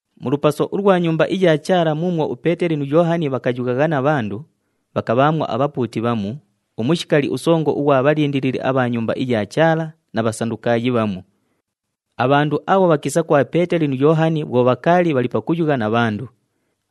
Mu lupaso ulwa Nyumba iya Chaala muumwo uPeeteli nu Yoohani bhakayughagha na bhandu, bhakabhaamwo abhapuuti bhamu, umushikali usongo ughwa bhalindilili abha Nyumba iya Chaala na Bhasandukaayi bhamu. Abhandu abho bhakiisa kwa Peeteli nu Yoohani bhwo bhakaali bhali pakuyugha na bhandu.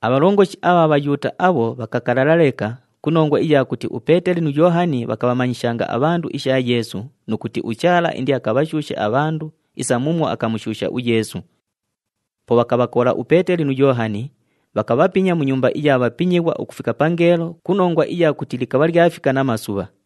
Abhalongoshi abha Bhayuuta abho bhakakalala leka ku nongwa iya kuti uPeeteli nu Yoohani bhakabhamanyishanga abhandu isha Yeesu nu kuti uChaala indiakabhashuushe abhandu isa muumwo akamushuusha uYeesu. Po bhakabhakola uPeeteli nu Yoohani, bhakabhapinya mu nyumba iya bhapinyighwa ukufika pangeelo ku nongwa iya kuti likabha lyafika namasubha.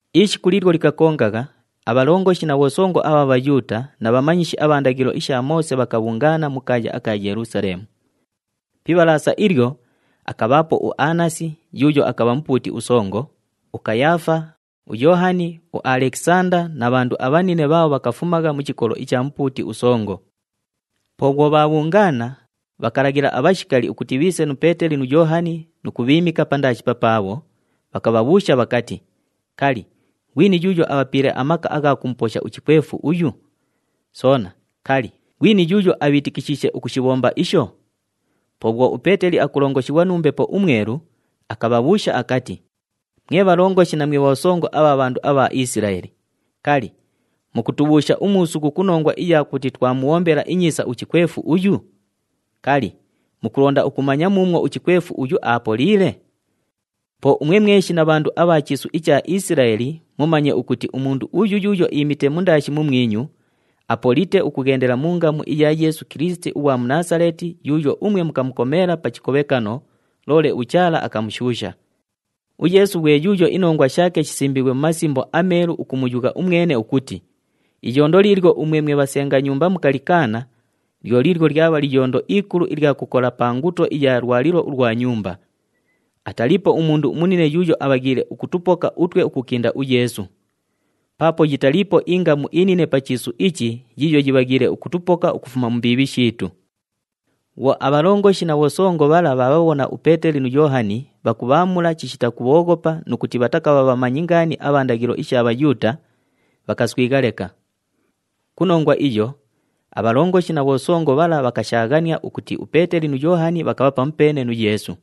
Ishiku liilyo likakongagha, abhalongoshi na bhosongo abha Bhayuuta na bhamanyishi abha ndaghilo isha Moose bhakabhungaana mu kaaya aka Yelusaleemu. Pi Ibhalaasa ilyo, akabhaapo uAnasi yuuyo akabha mupuuti usongo, uKayaafa, uYoohani, uAlekisanda na bhandu abhanine bhaabho bhakafumagha mu chikolo icha mupuuti usongo. Po bhwo bhaabhungaana, bhakalaghila abhashikali ukuti bhiise nu Peeteli nu Yoohani nu kubhiimika pandaashi papaabho, bhakabhabhuusha bhakati, “Kali, ghwini yuuyo abhapiile amaka agha kumuposha uchikwefu uyu? Soona, kali, ghwini yuuyo abhiitikishiishe ukushibhomba isho?” Po bhwo uPeeteli akulongoshighwa nu Mbepo uMwelu, akabhabhuusha akati, “Mwe bhalongoshi na mwe bhosongo abha bhandu abha Isilaeli, kali, mukutubhuusha umuusughu ku nongwa iya kuti twamubhombela inyiisa uchikwefu uyu? Kali, mukulonda ukumanya muumwo uchikwefu uyu aapoliile? Po umwe mweshi na bhandu abha chiisu icha Isilaeli mumanye ukuti umundu uyu yuuyo iimite mundaashi mumwinyu, aapolite ukughendela mu ngamu iya Yeesu Kilisiti ughwa mu Naasaleeti yuuyo umwe mukamukomeela pa chikobhekano, loole uChaala akamushuusha. UYeesu ghwe yuuyo inongwa shaake shisimbiighwe mu Masimbo aMeelu ukumuyugha umwene ukuti, ‘Iyondo liilyo umwe mwe bhasenga nyumba mukalikaana, lyo liilyo lyabha liyondo ikulu ilya kukola pa nguto iya lwalilo ulwa nyumba.’ “Ataliipo umundu umunine yuuyo abhaghiile ukutupoka utwe ukukinda uYeesu. Paapo yitaliipo ingamu inine pa chiisu ichi yiiyo yibhaghiile ukutupoka ukufuma mu mbiibhi shiitu.” Bhwo abhalongoshi na bhosongo bhala bhaabhabhona uPeeteli nu Yoohani bhakubhaamula chishita kubhooghopa nu kuti bhatakabha bhamanyi ngaani abha ndaghilo isha Bhayuuta, bhakaswigha leka. Ku nongwa iyo, abhalongoshi na bhosongo bhala bhakashaaghania ukuti uPeeteli nu Yoohani bhakabha pamupeene nu Yeesu.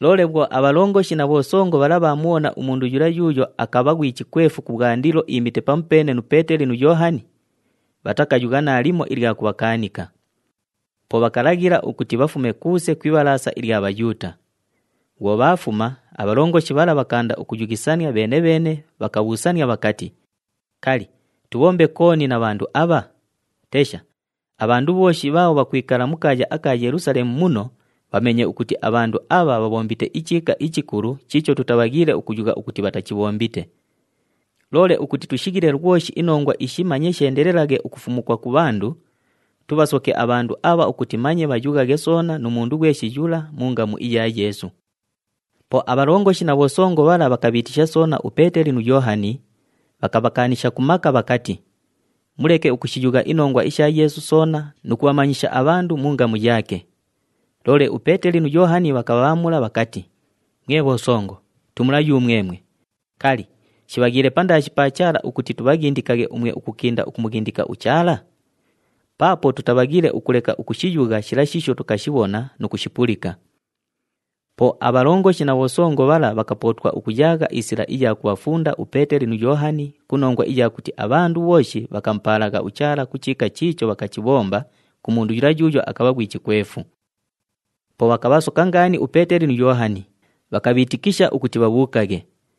Loole bhwo abhalongoshi na bhosongo bhala bhaamubhona umundu yula yuuyo akabha ghwi chikwefu kubhwandilo iimite pamupeene nu Peeteli nu Yoohani, bhatakayugha naalimo ilya kubhakaanika. Po bhakalaghila ukuti bhafume kuuse ku Ibhalaasa ilya Bhayuuta. Bhwo bhaafuma, abhalongoshi bhala bhakaanda ukuyughisania bheene-bheene, bhakabhuusania bhakati, “Kali, tubhombe kooni na bhandu abha? Tesha, abhandu bhooshi bhaabho bhakwikala mu kaaya aka Yelusaleemu muno bhameenye ukuti abhandu abha bhaabhombite ichiika ichikulu chiicho tutabhaghiile ukuyugha ukuti bhatachibhombite. Loole ukuti tushighile lwoshi inongwa ishi manye sheendelelaghe ukufumukwa ku bhandu, tubhasoke abhandu abha ukuti manye bhayughaghe soona nu mundu ghweshi yula mu ngamu iya Yeesu.” Po abhalongoshi na bhosongo bhala bhakabhiitisha soona uPeeteli nu Yoohani, bhakabhakaanisha ku maka bhakati, “Muleke ukushiyugha inongwa isha Yeesu soona nu kubhamanyisha abhandu mu ngamu yaake.” Loole uPeeteli nu Yoohani bhakabhaamula bhakati, “Mwe bhosongo, tumula yumwemwe, kali, shibhaghiile pandaashi pa Chaala ukuti tubhaghindikaghe umwe ukukinda ukumughindika uChaala? Paapo tutabhaghiile ukuleka ukushiyugha shila shiisho tukashibhona nu kushipulika.” Po abhalongoshi na bhosongo bhala bhakapootwa ukuyaagha isila iya kubhafunda uPeeteli nu Yoohani ku nongwa iya kuti abhandu bhooshi bhakamupaalagha uChaala ku chiika chiicho bhakachibhomba ku mundu yula yuuyo akabha ghwi chikwefu. Po bhakabhasoka ngaani uPeeteli nu Yoohani, bhakabhiitikisha ukuti bhabhuukaghe.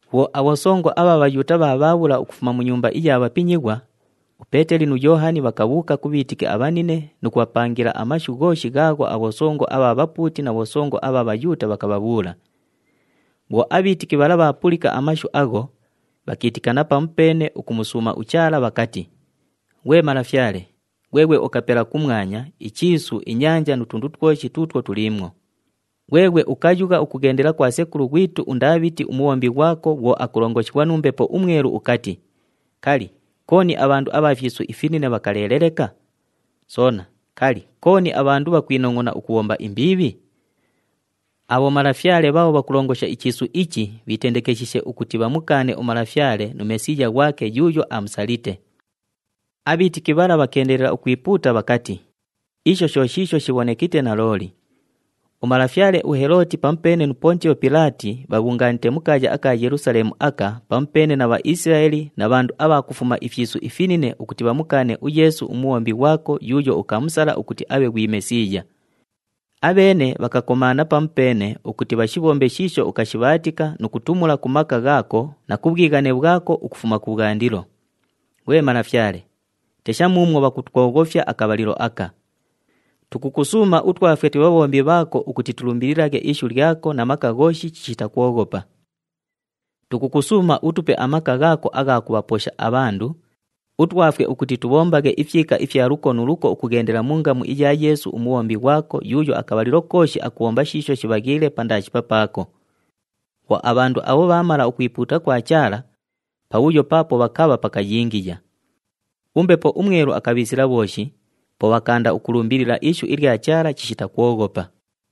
Bhwo abhosongo abha Bhayuuta bhaabhaabhula ukufuma mu nyumba iya bhapinyighwa, uPeeteli nu Yoohani bhakabhuuka ku bhiitiki abhanine nu kubhapangila amashu ghooshi ghaagho abhosongo abha bhapuuti na bhosongo abha Bhayuuta bhakabhabhuula. Bhwo abhiitiki bhala bhaapulika amashu agho, bhakiitikana pamupeene ukumusuuma uChaala bhakati, “Ghwe Malafyale, ghweghwe ukapela kumwanya, ichiisu, inyanja nu tundu twoshi tuutwo tuliimwo. Ghweghwe ukayugha ukughendela kwa sekulu ghwitu uNdaabhiti umubhombi ghwako bhwo akulongoshighwa nu Mbepo uMwelu ukati, ‘Kali, kooni abhandu abha fyisu ifinine bhakaleele leka? Soona, kali, kooni abhandu bhakwinongʼona ukubhomba imbiibhi? Abhomalafyale bhaabho bhakulongosha ichiisu ichi bhiitendekeshiishe ukuti bhamukaane uMalafyale nu Mesiiya ghwake yuuyo amusalite.’” Abhiitiki bhala bhakeendelela ukwipuuta bhakati, “Isho sho shiisho shibhonekite nalooli. Umalafyale uHelooti nu Pontiyo Pilaati bhabhungaanite mu kaaya aka Yelusaleemu aka pamupeene na Bhaisilaeli na bhandu abha kufuma ifyisu ifinine ukuti bhamukaane uYeesu uMubhombi ghwako yuuyo ukamusala ukuti abhe ghwi Mesiiya. Abheene bhakakomaana pamupeene ukuti bhashibhombe shiisho ukashibhaatika nu kutumula ku maka ghaako na ku bhwighane bhwako ukufuma kubhwandilo. Ghwe Malafyale, tesha muumwo bhakutwoghofya akabhalilo aka! Tukukusuuma utwafwe twe bhabhombi bhaako ukuti tulumbililaghe ishu lyako na maka ghooshi chishita kwoghopa. Tukukusuuma utupe amaka ghaako agha kubhaposha abhandu, utwafwe ukuti tubhombaghe ifyika ifya luko nu luko ukughendela mu ngamu iya Yeesu uMubhombi ghwako yuuyo akabhalilo kooshi akubhomba shiisho shibhaghiile pandaashi papaako.” Bhwo abhandu abho bhaamala ukwipuuta kwa Chaala, pabhuyo paapo bhakabha pakayingiya. UMbepo uMwelu akabhiisila bhooshi, po bhakaanda ukulumbilila ishu ilya Chaala chishita kwoghopa.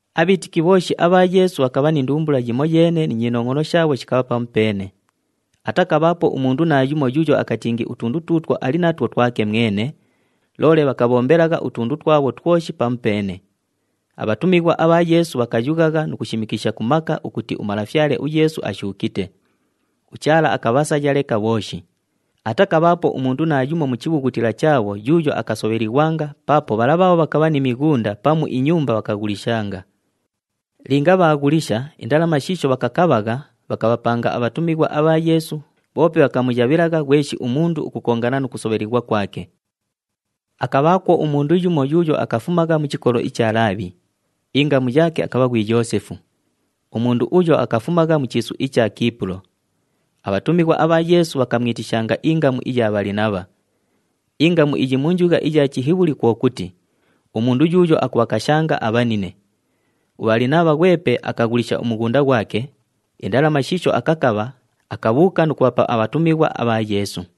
Abhiitiki bhooshi abha Yeesu bhakabha ni ndumbula yimoyeene ni nyinongʼono shaabho shikabha pamupeene. Atakabhaapo umundu naayumo yuuyo akatingi utundu tuutwo ali natwo twake mwene, loole bhakabhombelagha utundu twabho twoshi pamupeene. Abhatumighwa abha Yeesu bhakayughagha nu kushimikisha ku maka ukuti uMalafyale uYeesu ashuukite. UChaala akabhasaya leka bhooshi. Atakabhaapo umundu naayumo mu chibhughutila chaabho yuuyo akasobhelighwanga paapo bhala bhaabho bhakabha ni mighunda pamu inyumba bhakaghulishanga. Linga bhaaghulisha, indalama shiisho bhakakabhagha, bhakabhapanga abhatumighwa abha Yeesu, bhoope bhakamuyabhilagha ghweshi umundu ukukongana nu kusobhelighwa kwake. Akabhaakwo umundu yumo yuuyo akafumagha mu chikolo icha Laabhi. Ingamu yaake akabha ghwi Yoosefu. Umundu uyo akafumagha mu chiisu icha Kiipulo. Abhatumighwa abha Yeesu bhakamwitishanga ingamu iya Bhalinabha. Ingamu iyi mu njugha iya Chihibhuli kwo kuti, umundu yuuyo akubhakashanga abhanine. UBhalinabha ghwepe akaghulisha umughunda ghwake, indalama shiisho akakabha, akabhuuka nu kubhapa abhatumighwa abha Yeesu.